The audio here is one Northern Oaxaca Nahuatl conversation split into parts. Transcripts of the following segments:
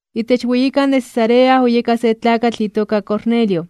Itech weyikan de Cesarea oyeka se tlakatl itoka Cornelio.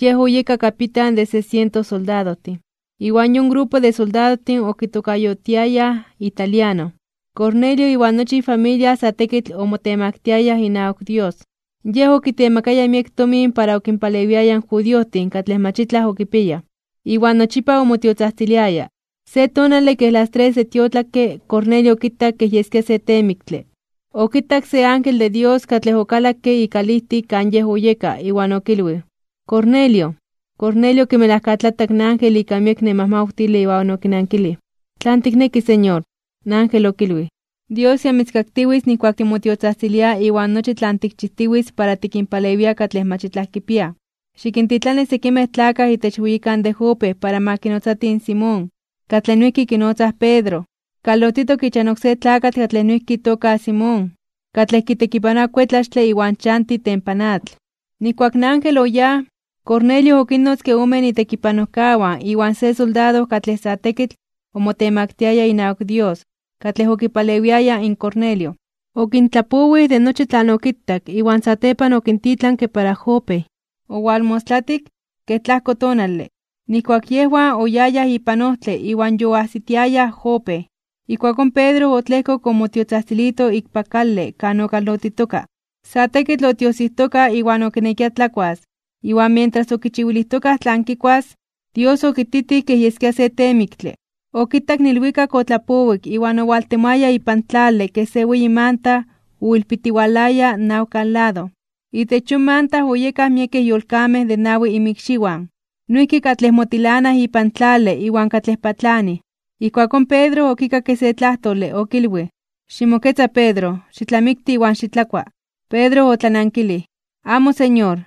Yej oyeka kapitan de se siento soldadojtin, iwan yon grupo de soldadojtin okitokayotiayaj Italiano. Cornelio iwan nochi ifamilia sa tekitl omotemaktiayaj inawak Dios. Yej okitemakaya miek tomin para okinpalewiaya in judiojtin katlej mach itlaj okipiayaj, iwan nochipa omotiotzajtziliaya. Se tonale, kej las tres de tiotlakke Cornelio okitak kej yeskia se teemiktle, okitak se ángel de Dios katlej okalakke ikalijtik kan yej oyeka iwan okilwij: ―¡Cornelio! Cornelio okimelajkatlatak in ángel ika miek nemawtile iwan okinankilij: ―¿Tlanon tikneki, Señor? In ángel okilwij: ―Dios ya mitzkaktiwitz nijkuak timotiotzajtzilia iwan nochi tlan tikchijtiwitz para tikinpalewia katlej mach itlaj kipiaj. Xikintitlani sekimej tlakaj itech weyikan de Jope para ma kinotzatij in Simón, katlej noijki kinotzaj Pedro. Kalotitok ichan oksé tlakatl katlej noijki itoka Simón, katlej kitekipanoa kuetlaxtle, iwan chanti itempan atl. Nijkuak in ángel oyáj, Cornelio okinnotzke omen itekipanojkawan iwan se soldado katlej sa tekitl omotemaktiaya inawak Dios katlej okipalewiaya in Cornelio. Okintlapowij de nochi tlan okitak, iwan satepan okintitlanke para Jope. Owalmostlatik, kej tlajko tonale, nijkuak yejwan oyayaj ipan ojtle iwan yoajsitiayaj Jope, ijkuakón Pedro otlejkok omotiotzajtzilito ikpak kale kan okalotitoka. Sa tekitl otiojsijtoka iwan okinekia tlakuas, iwan mientras okichiwilijtokaj tlan kikuas, Dios okititij kej yeskia se teemiktle, okitak in ilwikak otlapowik iwan owaltemoaya ipan tlale kej se weyi manta oilpitiwalaya nawkan lado. Itech yon manta oyekaj miekej yolkamej de nawi inmikxiwan, noijki katlej motilanaj ipan tlale iwan katlej patlanij. Ijkuakón Pedro okikakke se tlajtole, okilwij: ―Ximoketza Pedro, xitlamikti iwan xitlakua. Pedro otlanankilij: ―¡Amo, Señor!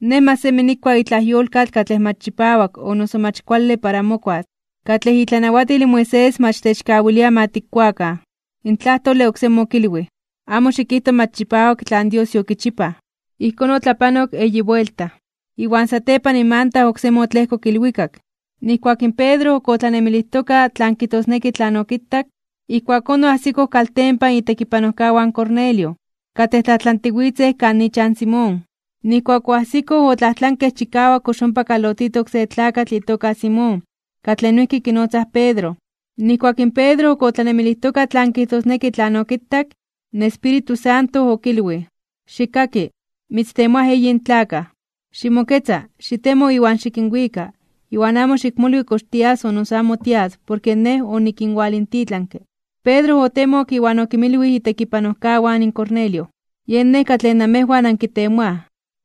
Nej mach semi nikua itlaj yolkatl katlej mach chipawak o noso mach kuale para mokuas, katlej itlanawatil in Moisés mach techkawilia ma tikkuakan. In tlajtole oksemi okilwij: ―Amo xikijto mach chipawak tlan Dios yokichipaj. Ijkón otlapanok eyi buelta, iwan satepan in manta oksemi otlejkok ilwikak. Nijkuak in Pedro ok otlanemilijtoka tlan kijtosneki tlan okitak, ijkuakón oajsikoj kaltempan itekipanojkawan in Cornelio, katlej tlajtlantiwitzej kan ichan in Simón. Nijkuak oajsikoj otlajtlankej chikawak kox ompa kalotitok se tlakatl itoka Simón, katlej noijki kinotzaj Pedro. Nijkuak in Pedro ok otlanemilijtoka tlan kijtosneki tlan okitak, in Espíritu Santo okilwij: ―Xikkaki, mitztemoaj eyin tlakaj. Ximoketza, xitemo iwan xikinwika iwan amo xikmolwi kox tias o noso amo porke Nej onikinwalintitlanke. Pedro otemok iwan okinmilwij itekipanojkawan in Cornelio: ―Yen nej katlej namejwan ankitemoaj.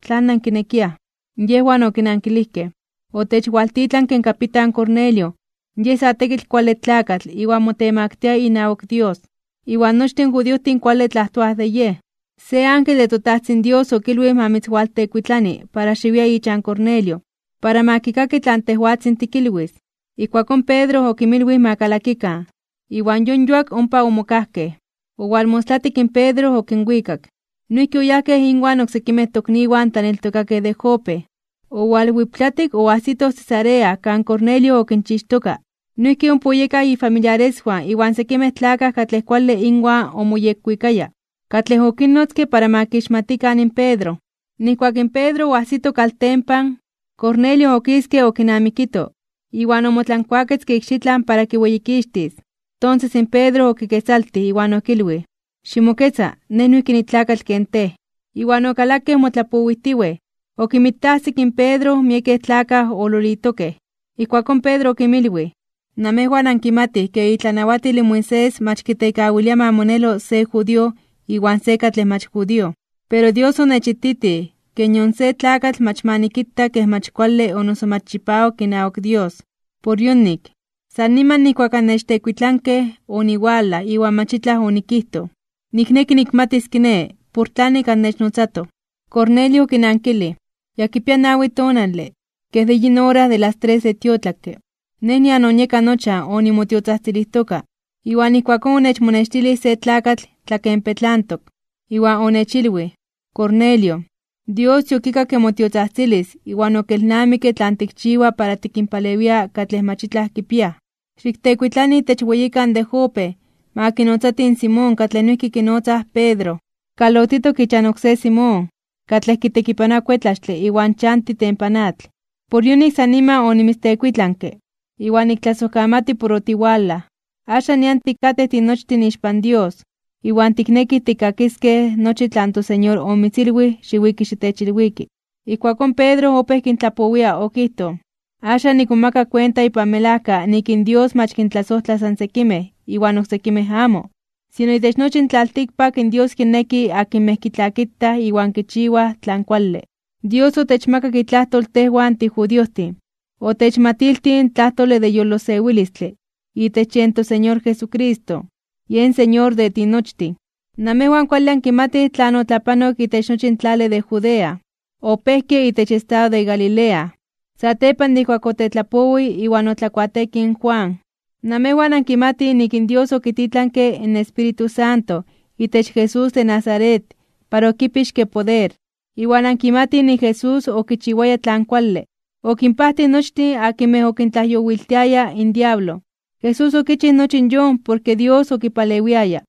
¿Tlan nankinekiaj? Yejwan okinankilijkej: ―Otechwaltitlanke in kapitan Cornelio, yej sa tekitl kuale tlakatl iwan motemaktia inawak Dios, iwan nochtin in judiojtin kuale tlajtoaj de yej. Se ángel de toTajtzin Dios okilwij ma mitzwaltekuitlani para xiwia ichan Cornelio, para ma kikaki tlan tejwatzin tikilwis. Ijkuakón Pedro okinmilwij ma kalakikan, iwan yon yuak ompa omokajkej. Owalmostlatik in Pedro okinwikak. Noijki oyajkej inwan oksekimej tokniwan tlaneltokakej de Jope. Owalwiptlatik oajsitoj Cesarea kan Cornelio okinchixtoka. Noijki ompa oyekaj ifamiliareswan iwan sekimej tlakaj katlej kuale inwan omoyekwikaya, katlej okinnotzke para ma kixmatikan in Pedro. Nijkuak in Pedro oajsito kaltempan, Cornelio okiske okinamikito, iwan omotlankuaketzke ikxitlan para kiweyikixtis. Tonses in Pedro okiketzaltij, iwan okilwij: ―Ximoketza, nej noijki nitlakatl ken tej. Iwan okalakej motlapowijtiwej, okinmitajsik in Pedro miekej tlakaj ololitokej. Ijkuakón Pedro okinmilwij: ―Namejwan ankimatij ke itlanawatil in Moisés mach kitekawilia ma monelo se judío iwan se katlej mach judío. Pero Dios onechititij ke nion se tlakatl mach ma nikita kej mach kuale o noso mach chipawak inawak Dios. Por yonik, san niman nijkuak annechtekuitlankej, oniwalaj iwan mach itlaj onikijtoj. Nikneki nikmatis kiné, por tlanik annechnotzatoj. Cornelio okinankilij: ―Ya kipia nawi tonale, kej de yin ora de las tres de tiotlakke, nej nian onieka nochan onimotiotzajtzilijtoka, iwan ijkuakón onechmonextilij se tlakatl tlakenpetlantok. Iwan onechilwij: “Cornelio, Dios yokikakke motiotzajtzilis iwan okelnamikke tlan tikchiwa para tikinpalewia katlej mach itlaj kipiaj. Xiktekuitlani itech weyikan de Jope, ma kinotzatij in Simón katlej noijki kinotzaj Pedro, kalotitok ichan oksé Simón, katlej kitekipanoa kuetlaxtle iwan chanti itempan atl.” Por yonik san niman onimitztekuitlanke, iwan niktlasojkamati por otiwalaj. Axan nian tikatej tinochtin ixpan Dios, iwan tiknekij tikkakiskej nochi tlan toSeñor omitzilwij xiwiki xitechilwiki. Ijkuakón Pedro opéj kintlapowia, okijtoj: ―Axan nikmomaka kuenta ipan melajka nik in Dios mach kintlasojtla san sekimej iwan oksekimej amo, sino itech nochi in tlaltikpak in Dios kinneki akinmej kitlakitaj iwan kichiwaj tlan kuale. Dios otechmakak itlajtol tejwan tijudiojtin, otechmatiltij in tlajtole de yolosewilistle itech yen toSeñor Jesucristo, yen Señor de tinochtin. Namejwan kuale ankimatij tlan otlapanok itech nochi in tlale de Judea. Opejke itech estado de Galilea, satepan de ijkuak otetlapowij iwan otlakuateekij in Juan. Namejwan ankimatij nik in Dios okititlanke in Espíritu Santo itech Jesús de Nazaret para okipixke poder. Iwan ankimatij nik in Jesús okichiwaya tlan kuale. Okinpajtij nochtin akinmej okintlajyowiltiaya in diablo. Jesús okichij nochi yon porke Dios okipalewiaya.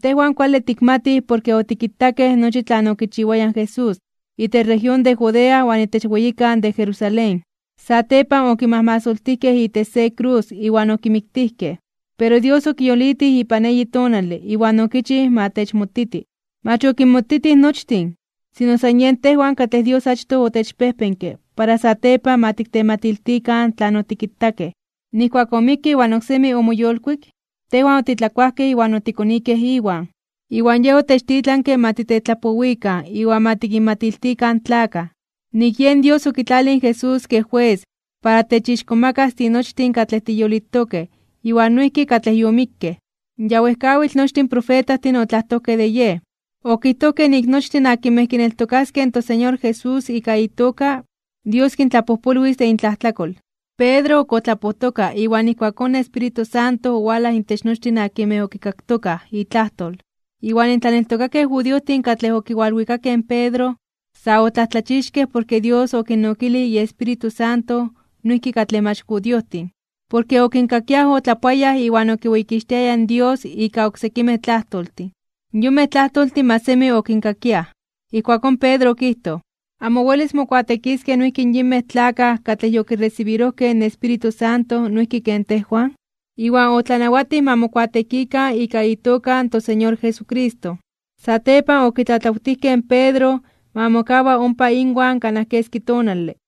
Tejwan kuale tikmatij porke otikitakej nochi tlan okichiwaya in Jesús, itech región de Judea iwan itech weyikan de Jerusalén. Satepan okimajmasoltijkej itech se krus iwan okimiktijkej. Pero Dios okiyolitij ipan eyi tonale, iwan okichij ma techmotiti. Mach okinmotitij nochtin, sino san tejwan katlej Dios achtoj otechpejpenke para satepan ma tiktematiltikan tlan otikitakej. Nijkuak omikke iwan oksemi omoyolkuik, tejwan otitlakuajkej iwan otikonikej Iwan. Iwan Yej otechtitlanke ma titetlapowikan iwan ma tikinmatiltikan in tlakaj, nik yen Dios okitlalij in Jesús kej jues para techixkomakas (techtzonmanas) tinochtin katlej tiyolitokej iwan noijki katlej yomikkej. Ya wejkawitl nochtin in profetajtin otlajtojkej de Yej. Okijtojkej nik nochtin akinmej kineltokaskej in toSeñor Jesús ika itoka, Dios kintlapojpolwis de intlajtlakol. Pedro ok otlapojtoka iwan ijkuakón in Espíritu Santo owalaj intech nochtin akinmej okikaktokaj itlajtol. Iwan in tlaneltokakej judiojtin katlej okiwalwikakej in Pedro, sa otlajtlachixkej (omomajmawtijkej) porke Dios okinnokilij iEspíritu Santo noijki katlej mach judiojtin. Porke okinkakiaj otlapoayaj iwan okiweyikixtiayaj in Dios ika oksekimej tlajtoltin. Yonmej tlajtoltin mach semi okinkakiaj. Ijkuakón Pedro okijtoj: ―¿Amo welis mokuateekiskej noijki in yinmej tlakaj katlej yokiresibirojkej in Espíritu Santo noijki ken tejwan? Iwan otlanawatij ma mokuateekikan ika itoka in toSeñor Jesucristo. Satepan okitlatlawtijkej in Pedro ma mokawa ompa inwan kanaj keski tonale.